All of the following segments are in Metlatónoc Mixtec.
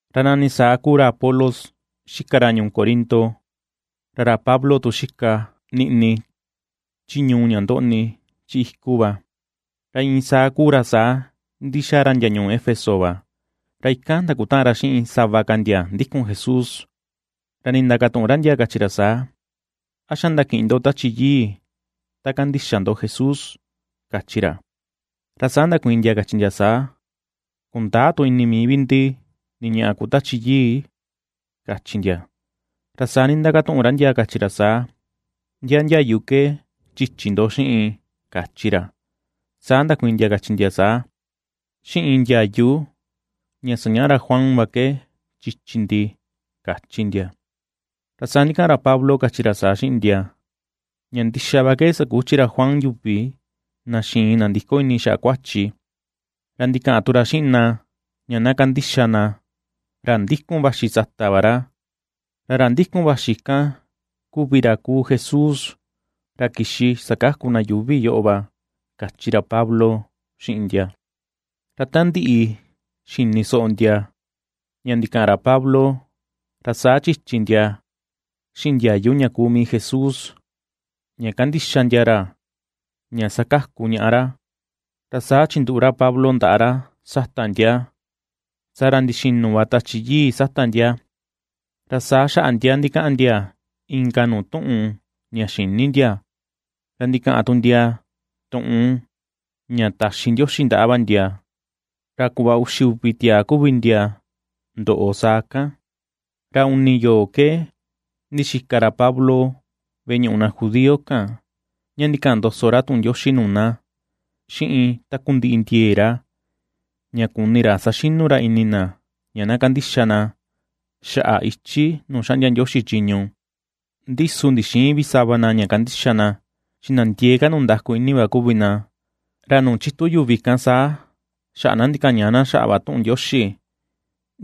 Ra nani saa kuu ra Apolos xika ra ñuu Corinto, ra ra Pablo tu xika niꞌni chi ñuu ña ndoꞌni chi iku va, ra iin saa kuu ra saa ndixaa ra ndia ñuu Éfeso va, ra ikan ndakutaꞌan ra xiꞌin sava ka ndia ndikun Jesús. Ra nindakatuꞌun ra ndia, kachi ra saa: ―¿A xa ndakiꞌin ndo Tachi Yii ta kandixa ndo Jesús? ―kachi ra. Ra saa ndakuiin ndia, kachi ndia saa: ―Kundäa tu ini mii vi ndi ni ñaꞌa kuu Tachi Yii ―kachi ndia. Ra saa nindakatuꞌun ra ndia, kachi ra saa: ―¿Ndia ndiayu ke chichi ndo xiꞌin? ―kachi ra. Saa ndakuiin ndia kachi ndia saa: ―Xiꞌin ndiayu ña sañaꞌa ra Juan va ke chichi ndi ―kachi ndia. Ra saa ndikaꞌan ra Pablo, kachi ra saa xiꞌin ndia: ―Ña ndixa va ke sakuchi ra Juan yuvi na xiin nandiko ini na xaꞌa kuachi, ra ndikaꞌan tu ra xiꞌin na ña na kandixa na ra ndikun vaxi sata va ra, ra ra ndikun vaxi kan, kuvi ra kuu Jesús, ra kixi sakaku na yuuvi yoꞌo va ―kachi Pablo xiꞌin ndia. Ra ta ndiꞌi xini soꞌo ndia ña ndikaꞌan ra Pablo, ra saa chichi ndia xiꞌin ndiayu ña kuu mii Jesús, ña kandixa ndia ra ña sakaku ñaꞌa ra. Ra saa chinduꞌu ra Pablo ndaꞌa ra sata ndia, saa ra ndixinu va Tachi Yii sata ndia, ra saa xaꞌa ndia ndikaꞌan ndia inka nuu tuꞌun ña xïni ndia, ra ndikaꞌan tu ndia tuꞌun ña taxi Ndioxi ndaꞌa va ndia. Ra kuꞌva uxi uvi tiaa kuvi ndia ndoꞌo saa kan. Ra uni yoo ke ndixika ra Pablo veꞌe ñuꞌu na judío kan, ña ndikaꞌan ndoso ra tuꞌun Ndioxi nuu na xiꞌin takundiꞌi ndiee ra, ña kuni ra saxinu ra ini na ña na kandixa na xaꞌa ichi nuu xaꞌndia Ndioxi chiñu. Ndi su ndixïin vi sava na ña kandixa na, chi na ndiee ka ndundaku ini va kuvi na, ra nuu chitu yuvi kan saa xaꞌa na ndikañaꞌa na xaꞌa va tuꞌun Ndioxi.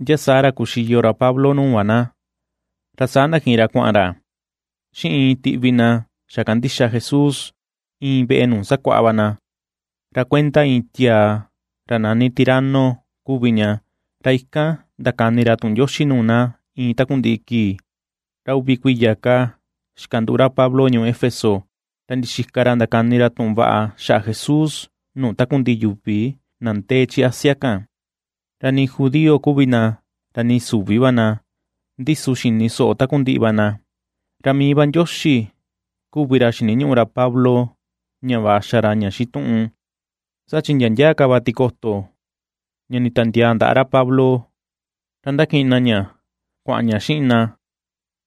Ndia saa ra kuxiyo ra Pablo nuu va na, ra saa ndakiꞌin ra kuaꞌan ra xiꞌin iin tiꞌvi na xa kandixa Jesús, iin veꞌe nuu sakuaꞌa va na, ra kuenda iin tiaa ra nani Tirano kuvi ña, ra ikan ndakani ra tuꞌun Ndioxi nuu na iin takundiꞌi kii. Ra uvi kuiya ka xikanduꞌu ra Pablo ñuu Éfeso, ra ndixika ra ndakani ra tuꞌun vaꞌa xaꞌa Jesús nuu takundiꞌi yuvi na ndee chi Asia kan; ra nii judío kuvi na, ra nii süvi va na ndi su xini soꞌo takundiꞌi va na. Ra mii va Ndioxi kuvi ra xiniñuꞌu ra Pablo ña vaꞌa xa ra ña xituꞌun, Saa chi ndia ndia ka va tikoto ña nditiandiaa ra Pablo, ra ^ndakiꞌin na ña kuaꞌan ña xiꞌin na,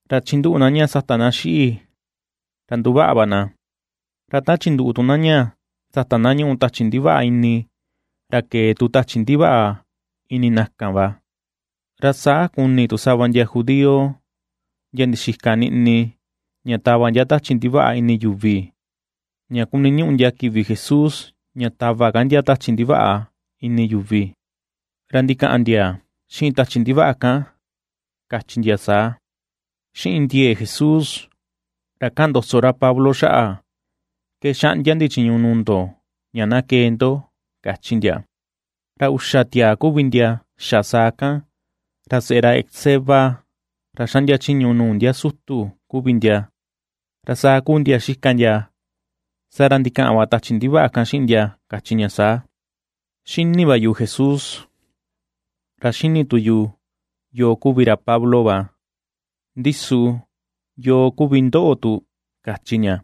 ra chinduꞌu na ña sata na xiꞌi, ra nduvaꞌa va na, ra ta chinduꞌu tu na ña sata na ñuꞌu tachi ndivaꞌa ini, ra kee tu tachi ndivaꞌa ini na kan va. Ra saa kuni tu sava ndia judío ndia ndixika niꞌni ña tava tachi ndivaꞌa ini yuvi, ña kuniñuꞌu ndia kivi Jesús ña tava ka ndia tachi ndivaꞌa ini yuvi, ra ndikaꞌan ndia xiꞌin tachi ndivaꞌa kan, kachi ndia saa: ―Xiꞌin ndiee Jesús, ra kaꞌan ndoso ra Pablo xaꞌa ke xaꞌndia ndi chiñu nuu ndo, ña na kee ndo ―kachi ndia. Ra uxa tiaa kuvi ndia xa saa kan, ra seꞌe ra Esceva, ra xaꞌndia chiñu nuu ndia sutu kuvi ndia. Ra saa kuu ndia xika ndia, saa ra ndikaꞌan va tachi ndivaꞌa kan xiꞌin ndia, kachi ña saa: ―Xini va yu Jesús, ra xini tu yu yoo kuvi ra Pablo va; ndi su, ¿yoo kuvi ndoꞌo tu? ―kachi ña.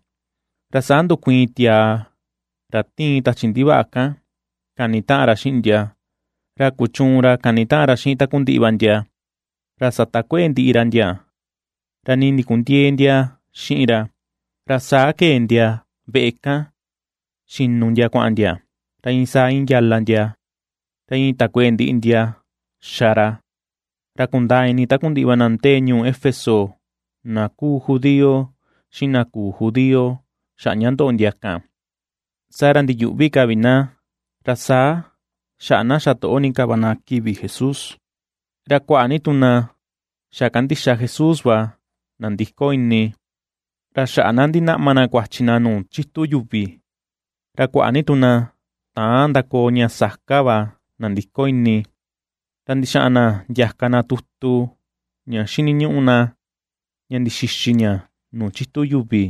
Ra saa ndukuiin tiaa ra tiin tachi ndivaꞌa kan kanitaꞌan ra xiꞌin ndia, ra kuchuun ra kanitaꞌan ra xiꞌin takundiꞌi va ndia, ra satakueꞌe ndiꞌi ra ndia, ra nii ndikundiëe ndia xiꞌin ra, ra saa kee ndia veꞌe kan xinu ndia kuaꞌan ndia, ra iin saa iin yala ndia, ra iin takueꞌe ndiꞌi ndia xa ra. Ra kundaa ini takundiꞌi va na ndee ñuu Éfeso, na kuu judío xiꞌin na küu judío xaꞌa ña ndoꞌo ndia kan, saa ra ndiyuꞌvi ka vi na, ra saa xaꞌa na xatoꞌo ni ka va na kivi Jesús. Ra kuaꞌa ni tu na xa kandixa Jesús va nandiko ini, ra xaꞌa na ndinaꞌma na kuachi na nuu chitu yuvi. Ra kuaꞌa ni tu na täan ndakoo ña saka va nandiko ini, ra ndixaꞌan na ndiaka na tutu ña xiniñuꞌu na ña ndixixi ña nuu chitu yuvi.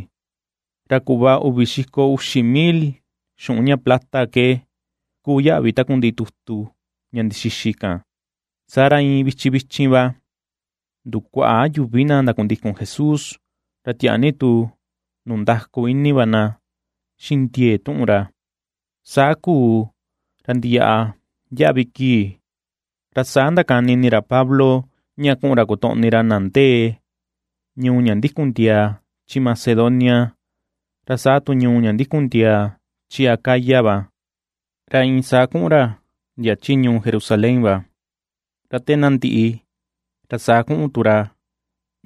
Ra kuꞌva uvi xiko uxi mil xuꞌun ña plata ke kuu yaꞌvi takundiꞌi tutu ña ndixixi kan. Saa ra iin vichin vichin va ndukuaꞌa yuvi na ndakundikun Jesús, ra tiaa ni tu ndundaku ini va na xiꞌin ndiee tuꞌun ra. Saa kuu, ra ndiyaꞌa ndiaꞌvi kii, ra saa ndakani ini ra Pablo ña kuꞌun ra kotoꞌni ra na ndee ñuu ña ndikun ndia chi Macedonia ra saa tu ñuu ña ndikun ndia chi Acaya va, ra iin saa kuꞌun ra ndia chi Jerusalén va, ra te na ndiꞌi ra saa kuꞌun tu ra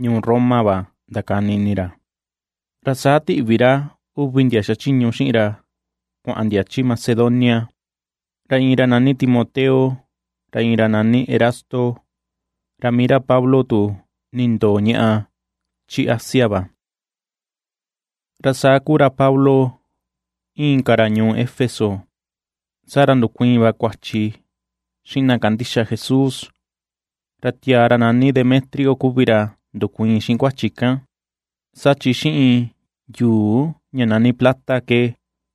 ñuu Roma va, ndakani ini ra. Ra saa tiꞌvi ra uvi ndia xachiñu xiꞌin ra kuaꞌan ndia chi Macedonia, ra iin ra nani Timoteo, ra iin ra nani Erasto; ra mii ra Pablo tu nindoo ñaꞌa chi Asia va. Ra saa kuu ra Pablo iin ka ra ñuu Éfeso, saa ra ndukuiin va kuachi xiꞌin na kandixa Jesús. Ra tiaa ra nani Demetrio kuvi ra ndukuiin xiꞌin kuachi kan, saa chi xiꞌin yuu ña nani plata ke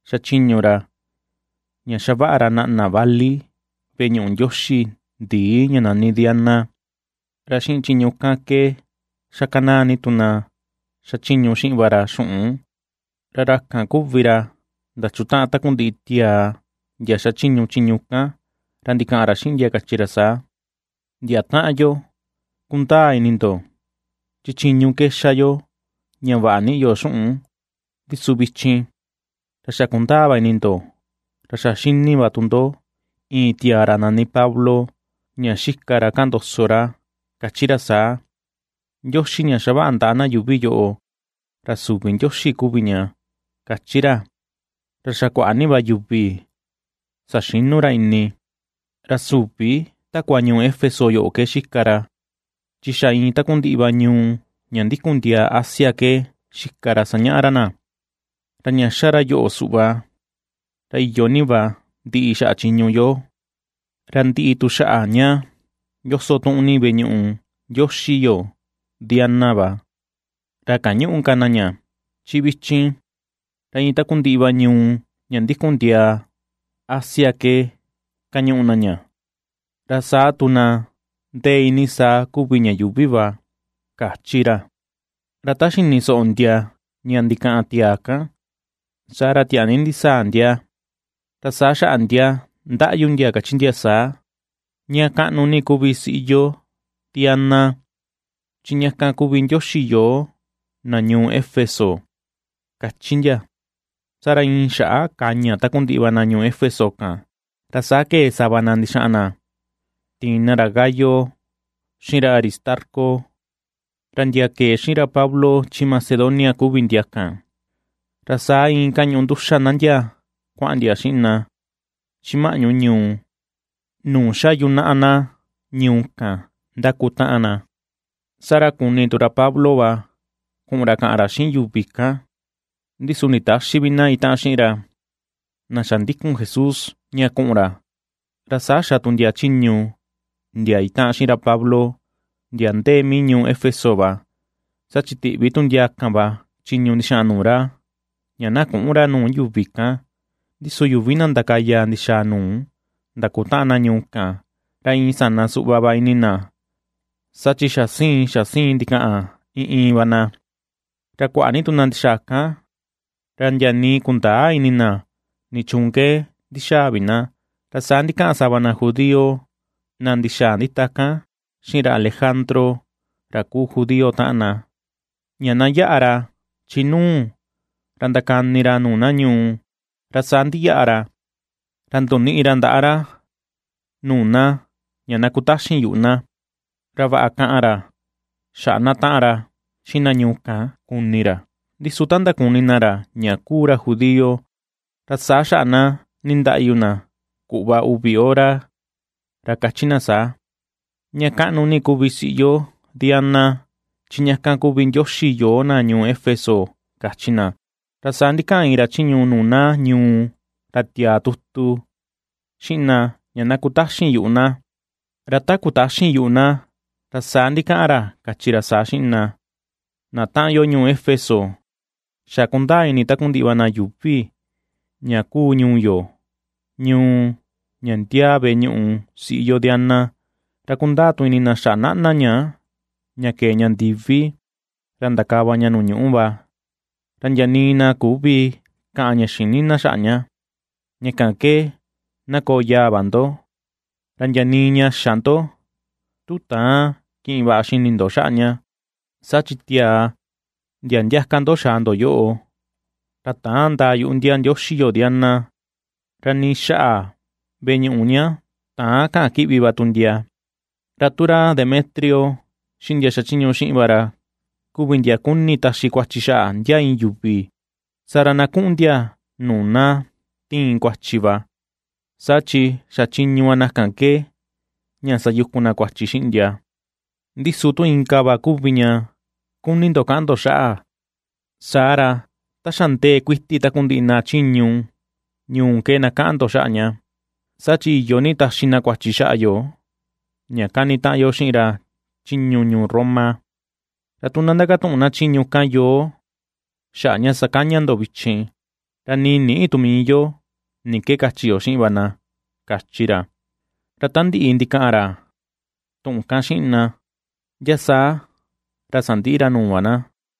xachiñu ra ña xavaꞌa ra naꞌna vali veꞌe ñuꞌu ndioxi ndii ña nani Diana, ra xiꞌin chiñu kan ke xakanaa ni tu na xachiñu xiꞌin va ra xuꞌun. Ra ra kan kuvi ra ndachutaꞌan takundiꞌi tiaa ndia xachiñu chiñu kan, ra ndikaꞌan ra xiꞌin ndia, kachi ra saa: ―Ndia taꞌan yo, kundaa ini ndo chi chiñu ke xaa yo ña vaꞌa niꞌi yo xuꞌun. Ndi su vichin ra xa kundaa va ini ndo, ra a xa ^xini va tu ndo iin tiaa ra nani Pablo, ña xika ra kaꞌan ndoso ra, kachi ra saa, “Ndioxi ña xavaꞌa ndaꞌa na yuuvi yoꞌo ra süvi ndioxi kuvi ña”, kachi ra, ra xa kuaꞌa ni va yuvi saxinu ra ini, ra süvi takua ñuu Éfeso yoꞌo ke xika ra, chi xa iin takundiꞌi va ñuu ña ndikun ndiaa Asia ke xika ra sañaꞌa ra na. Ra ña ^xa ra yoꞌo suꞌva, ra iyo ni va ndiꞌi xaꞌa chiñu yo, ra ndiꞌi tu xaꞌa ña yoso tuꞌun ni veꞌe ñuꞌu ndioxi yo, Diana va, ra kañüꞌu ka na ña. Chi vichin ra iin takundiꞌi va ñuu ña ndikun ndiaa Asia ke kañuꞌu na ña, ra saa tu na ndee iinii saa kuvi ña yuuvi va ―kachi ra. Ra ta xini soꞌo ndia ña ndikaꞌan tiaa kan, saa ra tiaa ni ndisaa ndia, ra saa xaꞌa ndia ndaꞌyu ndia, kachi ndia saa: ―¡Ña kaꞌnu ni kuvi siꞌi yo Diana, chi ña kan kuvi ndioxi yoo na ñuu Éfeso! ―kachi ndia. Saa ra iin xaꞌa kaña takundiꞌi va na ñuu Éfeso kan, ra saa kee sava na ndixaꞌan na tiin na ra Gayo xiꞌin ra Aristarco, ra ndia kee xiꞌin ra Pablo chi Macedonia kuvi ndia kan, ra saa iin kañuꞌu nduxa na ndia kuaꞌan ndia xiꞌin na, chi maꞌñu ñuu, nuu xa yunaꞌa na ñuu kan ndakutaꞌan na. Saa ra kuni tu ra Pablo va kuꞌun ra kaꞌan ra xiꞌin yuvi kan, ndi su nditäxi vi na itaꞌan xiꞌin ra, na xa ndikun Jesús, ña kuꞌun ra. Ra saa xa tu ndia chiñu ndia itaꞌan xiꞌin ra Pablo ndia ndee mii ñuu Éfeso va, saa chi tiꞌvi tu ndia kan va chiñu ndixaꞌan nuu ra, ña na küꞌun ra nuu yuvi kan. Ndi su yuvi na ndakaya ndixaa nuu ^ndakutaꞌan na ñuu kan, ra iin sana suꞌva va ini na, saa chi xa siin xa siin ndikaꞌan iin iin va na, ra kuaꞌa ni tu na ndixaa kan, ra ndia nii kundäa ini na nichuun ke ndixaa vi na. Ra saa ndikaꞌan sava na judío na ndixaa ndita kan xiꞌin ra Alejandro ra kuu judío taꞌan na, ña na yaꞌa ra chi nuu, ra ndakani ra nuu na ñuu; ra saa ndiyaꞌa ra, ra ndoniꞌi ra ndaꞌa ra nuu na ña na kutaxin yuꞌu na, ra vaꞌa kaꞌan ra xaꞌa na taꞌan ra xiꞌin na ñuu kan kuni ra. Ndi su ta ndakuni na ra ña kuu ra judío, ra saa xaꞌa nindaꞌyu na kuꞌva uvi hora, ra kachi na saa: ―¡Ña kaꞌnu ni kuvi siꞌi yo Diana, chi ña kan kuvi ndioxi yoo na ñuu Éfeso! ―kachi na. Ra saa ndikaꞌan iin ra chiñu nuu na ñuu ra tiaa tutu, xiꞌin na ña na kutaxin yuꞌu na, ra ta kutaxin yuꞌu na, ra saa ndikaꞌan ra kachi ra saa xiꞌin na: ―Na taꞌan yo ñuu Éfeso, xa kundaa ini takundiꞌi va na yuuvi ña kuu ñuu yo, ñuu ña ndiaa veꞌe ñuꞌu siꞌi yo Diana, ra kundaa tu ini na xaꞌa naꞌna ña, ña kee ña ndivi, ra ndakava ña nuu ñuꞌu va. Ra ndia nii na küvi kaꞌan ña xïni xaꞌa ña, ña kan ke na koo yaa va ndo, ra ndia nii ña xä ndo, tu täan kiꞌin vaꞌa xini ndo xaꞌa ña. Saa chi tiaa ndia ndiaka ndo xaa ndo yoꞌo, ra täan ndaa yuꞌu ndia ndioxi yo Diana, ra ni xaꞌa veꞌe ñuꞌu ña täan kaꞌan kiꞌvi va tu ndia. Ra tu ra Demetrio, xiꞌin ndia xachiñu xiꞌin va ra, kuvi ndia kuni taxi kuachi xaꞌa ndia iin yuvi, saa ra na kuꞌun ndia nuu na tiin kuachi va, saa chi xa chiñu va na kan ke, ña sayukun na kuachi xiꞌin ndia. Ndi su tu inka va kuvi ña kuni ndo kaꞌan ndo xaꞌa, saa ra ta xa ndee kuiti takundiꞌi na chiñu ñuu ke na kaꞌan ndo xaꞌa ña. Saa chi iyo ni taxi na kuachi xaꞌa yo ña kanitaꞌan yo xiꞌin ra chiñu ñuu Roma. Ra tu na ndakatuꞌun na chiñu kan yoo xaꞌa ña sakaña ndo vichin, ra nii nïꞌi tu mii yo ni ke kachi yo xiꞌin vi na ―kachi ra. Ra ta ndiꞌi ndikaꞌan ra tuꞌun kan xiꞌin na, ndia saa ra sandiꞌi ra nuu va na.